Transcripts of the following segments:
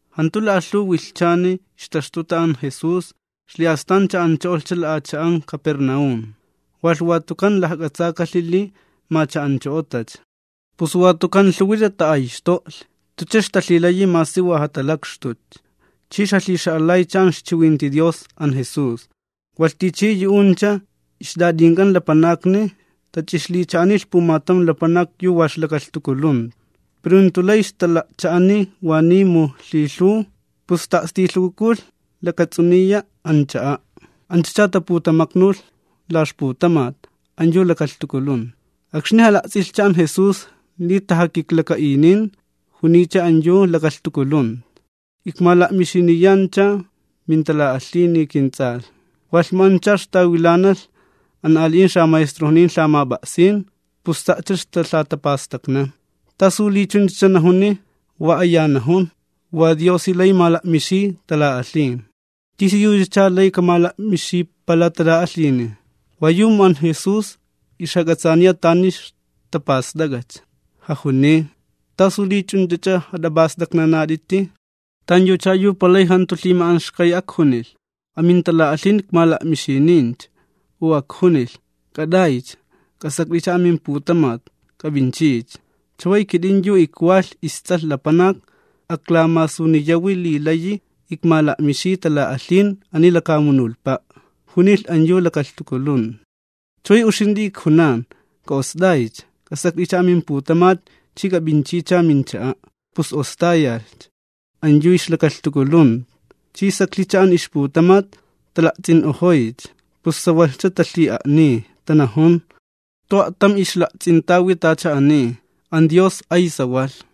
Jantu la'alhuw wilhchani ixtaxtuta an Jesús, xli'astan cha'ancho'olhcha la'acha'an Capernaúm, walh watukan lajk'atsakalhi li ma cha'ancho'otacha. Pus watukan lhuwi tata'ayxto'lhi, jantucha ixtalhilayi masi wa jatalakxtutcha, chi ixjalhixa'alaycha an ixchiwinti Dios an Jesús. Walh tichi yu'uncha ixt'at'ink'an lapanakni tach'ixlicha'anilh pumatam lapanak yu wa ixlakalhtukulunta. Pero jantu lay ixtala'cha'ani waniy mu lhilhuw, pus ta'a'stilhukukulh lakats'uniya an cha'a'. Anchacha taputamaknulh la ixputamat an yu lakalhtukulunta. Akxni jala'ts'ilhi li tajakiklaka'inin, juniy an yu lakalhtukulunta: ―Ikmala'mixiniyani mintala'alhini kints'alh. Walh mu ancha ixtawilanalh an ali'in xamaestrojnin lhamap'a'sin, pus sa'cha ixtalhatapastaknan: “¿Tasu li chunchacha najuni? Wa aya najun, wa Diosi lay mala'mixiy tala'alhin. ¿Tisiyuchacha lay kamala'mixipala tala'alhini?” Wayu mu an Jesús ixjak'atsaaniya tani ixtapast'ak'acha, jajuniy: ―¿T'asu li ch'unch'ach'a jat'ap'ast'aknanat'iti? ¿Tanyucha yu palay jantu lhima'anxkay ajkunilh: “Amintala'alhin ikmala'mixinincha”, u ajkunilh: “K'at'aycha k'asakt'icha amimputamat k'ap'inchicha”? Chaway kit'in yu ikwalh isTs'alh Lapanak aklamasuniyawi li layi ikmala'mixiy tala'alhin ani lakamunulhpa'. Junilh an yu lakalhtukulunta: ―Chaway uxint'i ijkunan k'a'ost'aycha, k'asakt'icha amimputamat chi k'ap'inchicha mincha'a'. Pus ostayalhcha an yu ixlakalhtukulunta, chi saklhicha an ixputamat, tala'ts'in'ojoycha, pus sawalhcha talhi'a'niy, tanajun: ―Jantu a'tam ixla'ts'intawi tacha ani. An Dios ay sawalh.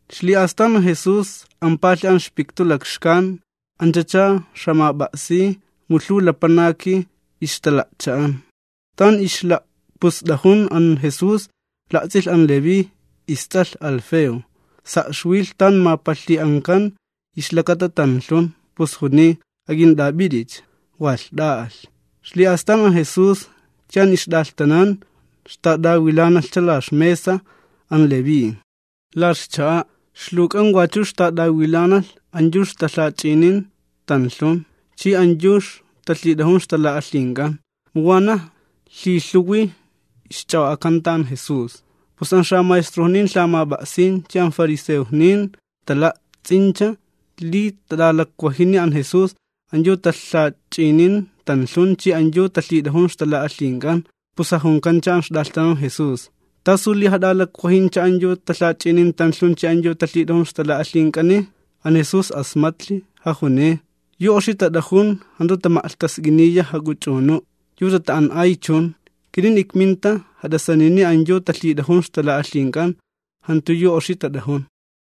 Xli'astan an Jesús ampalhi an ixpiktu lakxkan, anchacha ixjamap'a'siy mu lhuw lapanakni ixtala'cha'an. Tan ixla'pust'ajun an Jesús la'ts'ilh an Leví, ists'alh Alfeo, sa' ixwilh tan mapalhlhi'ankan ixlakata tanlhun, pus juniy: ―Ak'int'ap'it'icha. Walh t'a'alhcha. Xli'astan an Jesús chi an ixt'alhtanan ixtat'awilanalhcha la ixmesa an Leví, la ixcha'a, ixluwk'an wachu ixtat'awilanalh an yu ixtalhach'inin tanlhun chi, an yu ixtalhit'ajun ixtala'alhink'an, mu wanaj lhilhuwi ixch'a'o'akanta an Jesús. Pus an xamaestrojnin lhamap'a'sin chi an fariseojnin tala'ts'incha li tat'alakwajini an Jesús an yu talhach'inin tanlhun chi an yu talhit'ajun ixtala'alhink'an, pus jajunkan an ixt'alhtanan Jesús: ―¿Tasu li jat'alakwajincha an yu talhach'inin tanlhun chi an yu talhit'ajun ixtala'alhink'ani? An Jesús asmatlhi, jajuniy: ―Yu oxi tat'ajun jantu tama'lhtask'iniya jak'uch'unu', yu tata'an'ay chun. Kit'in ikminta jat'asanini an yu talhit'ajun ixtala'alhink'an, jantu yu oxi tat'ajun.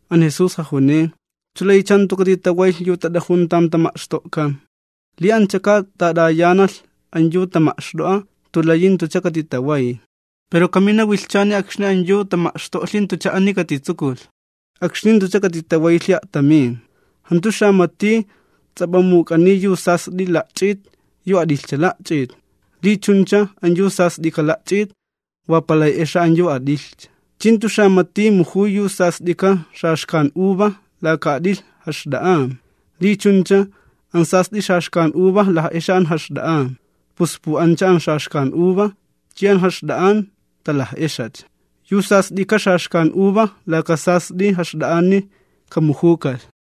An Jesús jajuniy: ―¿Chu laycha jantu katitawaylh yu tat'ajun tan tama'xto'kan? Li anchaka tat'ayanalh an yu tama'xt'o'a jantu layi katitalhitask'ajalhcha ixwaytk'an. Pero kamina wilhchani akxni an yu tama'xto'lhi jantucha ani katitsukulh. Akxni katalhitask'ajayacha ixwayk'an a'tamin. Jantu xamati ts'ap'amuk'aniy yu sast'ika la'ch'it yu at'ilhcha la'ch'it, li chuncha, an yu sast'ika la'ch'it wa palay exa an yu at'ilhcha. Chi jantu xamati mujuy yu sast'ika xaxkan uva laka at'ilh jaxt'a'an, li chuncha, an sast'i xaxkan uva laj'exa an jaxt'a'an, pus pu'ancha an xaxkan uva chi an jaxt'a'an talaj'exacha. Yu sast'ika xaxkan uva laka sast'i jaxt'a'ani kamujukalh.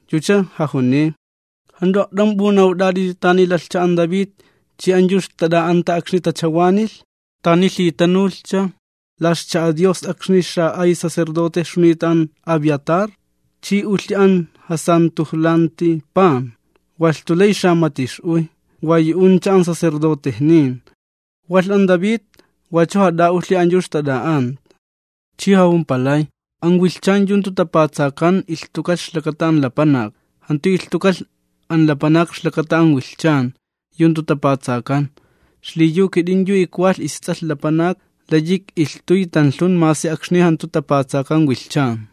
Yucha jajuniy: ―¿Jant'u a'tam p'unawt'at'iti tani lalhcha an David chi an yu ixtat'a'anta akxni tachawanalh? Yucha tanulhi an la ixcha'a Dios akxni xa'ay sacerdote ixjunita an Abiatar, chi ulhi an jamatajtanilanti pan, walh jantu lay xamati ix'uy, wa yu'uncha an sacerdotejnin, walh an David wachu jat'a'ulhi an yu ixtat'a'anta. Chi jajumpalay: ―An wilhchan akxni jantu tapatsakan, ilhtukalh ixlakata an lapanak, jantu ilhtukalh an lapanak ixlakata an wilhchan akxni jantu tapatsakan. Xliyu kit'in yu ikwalh isTs'alh Lapanak ikch'alhkatnani masi akxni jantu tapatsakan wilhchan.